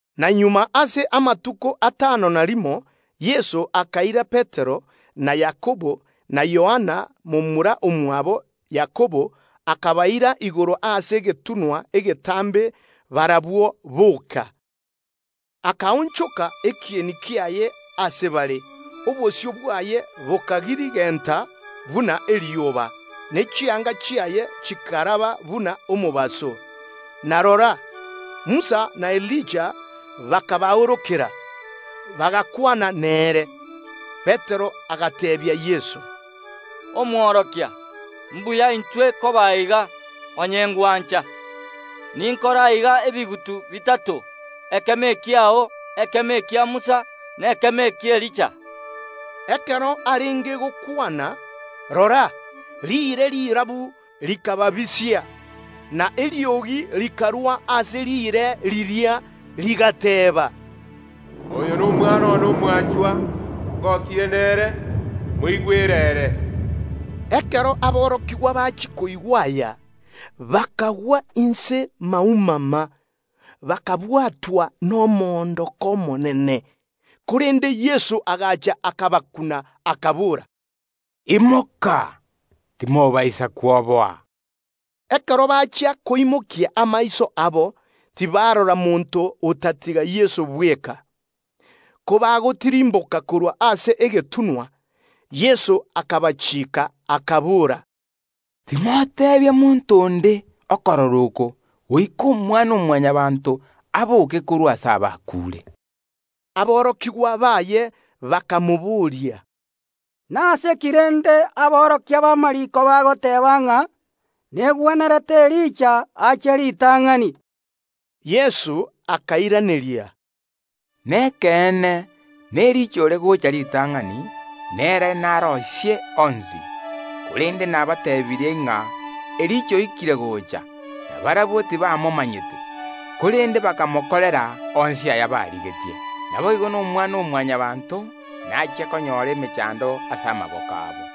Na nyuma y’amatuko atano na rimo Yeso akaira Petero, na Yakobo, na Yohana momura omwabo Yakobo, bakagenda nabarabwo igoro ase egetunwa egetambe barabwo boka. Akaonchoka ekieni kiaye ase bare, obosio bwaye bokagirigenta buna erioba, ne chianga chiaye chikaraba buna omobaso. Na rora, Musa na Elija bakabaorokera, bagakwana nere. Petero agateebia Yeso, “Omonene, mbuya intwe koba aiga; onye ngwancha, ninkore aiga ebigutu bitato, ekemo ekiao, ekemo ekia Musa, na ekemo eki’Elija.” Ekero arenge gokwana, rora, riire rirabu rikababisia, na eriogi rikarwa ase riire riria, rigateba, “Oyo n’Omwana one omwanchwa, ngokirie nere; moigwere ere.” Ekero aborokigwa bachia koigwa aya, bakagwa inse maumama, bakabwatwa nomoondoko omonene. Korende Yeso agacha akabakuna, akabora, “Imoka, timobaisa kwoboa.” Ekero bachia koimokia amaiso abo, tibarora monto otatiga Yeso bweka. Kobagotirimboka korwa ase egetunwa, Yeso akabatianera, akabora, “Timoteebia monto onde okorora oko goika Omwana-o-Mwanyabaanto aboke korwa ase abakuure.” Aborokigwa baye bakamobooria, “Nase ki rende aborokia b’amariiko bagoteeba ng’a negwenerete Elija ache ritang’ani?” Yeso akabairaneria, “Nekeene, n’Elija ogochia gocha ritang’ani, na ere naroisie onsi. Korende nabateebirie ng’a Elija oikire gocha; na barabwo tibamomanyete, korende bakamokorera onsi aya barigetie. Naboigo n’Omwana-o-Mwanyabaanto nachie konyora emechando ase amaboko abo.”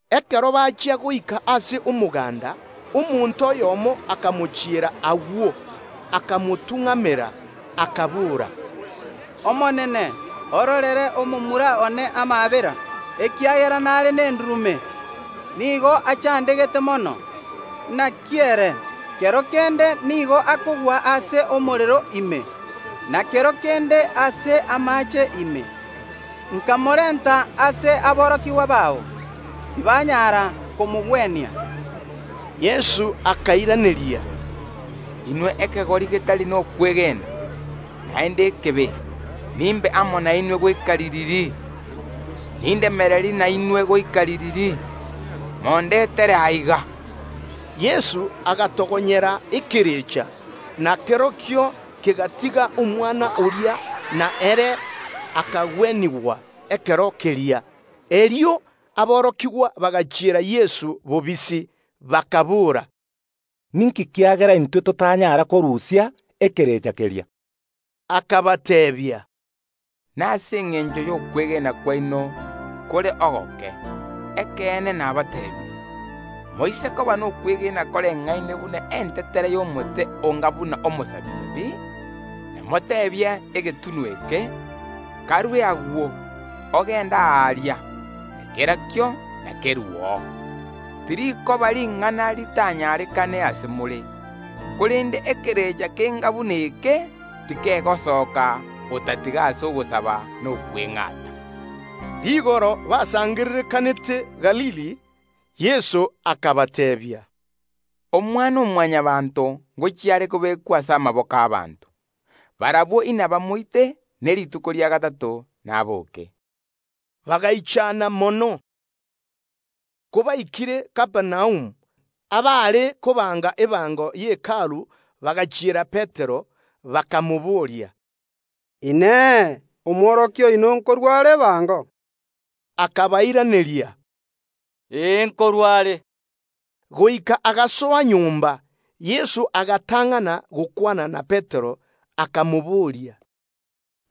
Ekero bachia goika ase omoganda, omonto oyomo akamochiera agwo, akamotung’amera, akabora, “Omonene, ororere omomura one amaabera, ekiagera nare nendurume, nigo achandegete mono. Inaki ere, kero kende nigo akogwa ase omorero ime, na kero kende ase amaache ime. Namorenta ase aborokigwa bao, tibanyara komogwenia.” Yeso akairaneria, “Inwe ekegori getari nokwegena, naende ekebe, nimbe amo nainwe goika ririri? Nindemererie nainwe goika ririri? Mondetere aiga.” Yeso agatogonyera ekerecha, na kerokio kegatiga omwana oria na ere akagwenigwa ekero keria. Erio aborokigwa bagachiera Yeso bobisi, bakaboora, “Ninki kiagera intwe titwanyara korusia ekerecha keria?” Akabateebia, “Nase engencho y’okwegena kwaino kore ogoke. Ekeene nabateebirie: Moise koba nokwegena koreng’aine buna entetere y’Omosirapi, inamoteebie egetunwa eke: Karue agwo, ogende aaria, na kerokio inakeruo, tirikoba ring’ana ritanyarekane ase more. [ Korende ekerecha kenga buna eke tikegosoka otatiga ase ogosaba na okweng’ata.”] Ekero basangererekanete Galili, Yeso akabateebia, “Omwana-o-Mwanyabaanto ngochia are kobekwa ase amaboko y’ abanto. Barabwo inabamoite, ne rituko ria gatato nabooke.” Bagaichana mono. Kobaikire Kapernaumu, abaare korusia ebango ye Hekalu bagachiera Petero, bakamobooria, “Inee! Omworokia oino nkorua are ebango?” Akabairaneria, “Ee, nkorua are.” Goika agasoa nyomba, Yeso agatang’ana gokwana na Petero, akamobooria,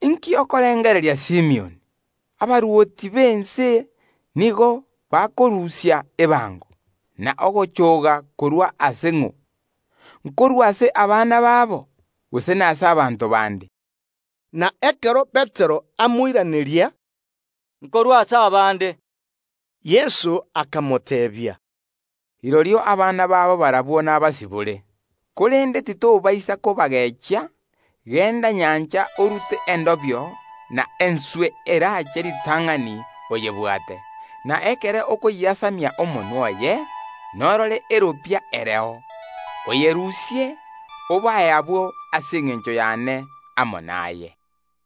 “Inki okorengereria Simioni? Nase ng’o abarwoti b’ense bakorusia ebango n’echoogo? Nkorwa ase abana babo, gose nase abanto bande?” Na ekero Petero amoiraneria, “Nkorwa ase abande,” Yeso akamoteebia, “Rirorio abana babo barabwo nabasibore. Korende titobaisa kobagechia, genda nyancha orute endobio na enswe eraache ritang’ani oyebwate; na ekero okoyiasamia omonwa oye norore egesamunye kiebesa kereo, okerusie, obae abwo ase engencho y’ane amo naye.”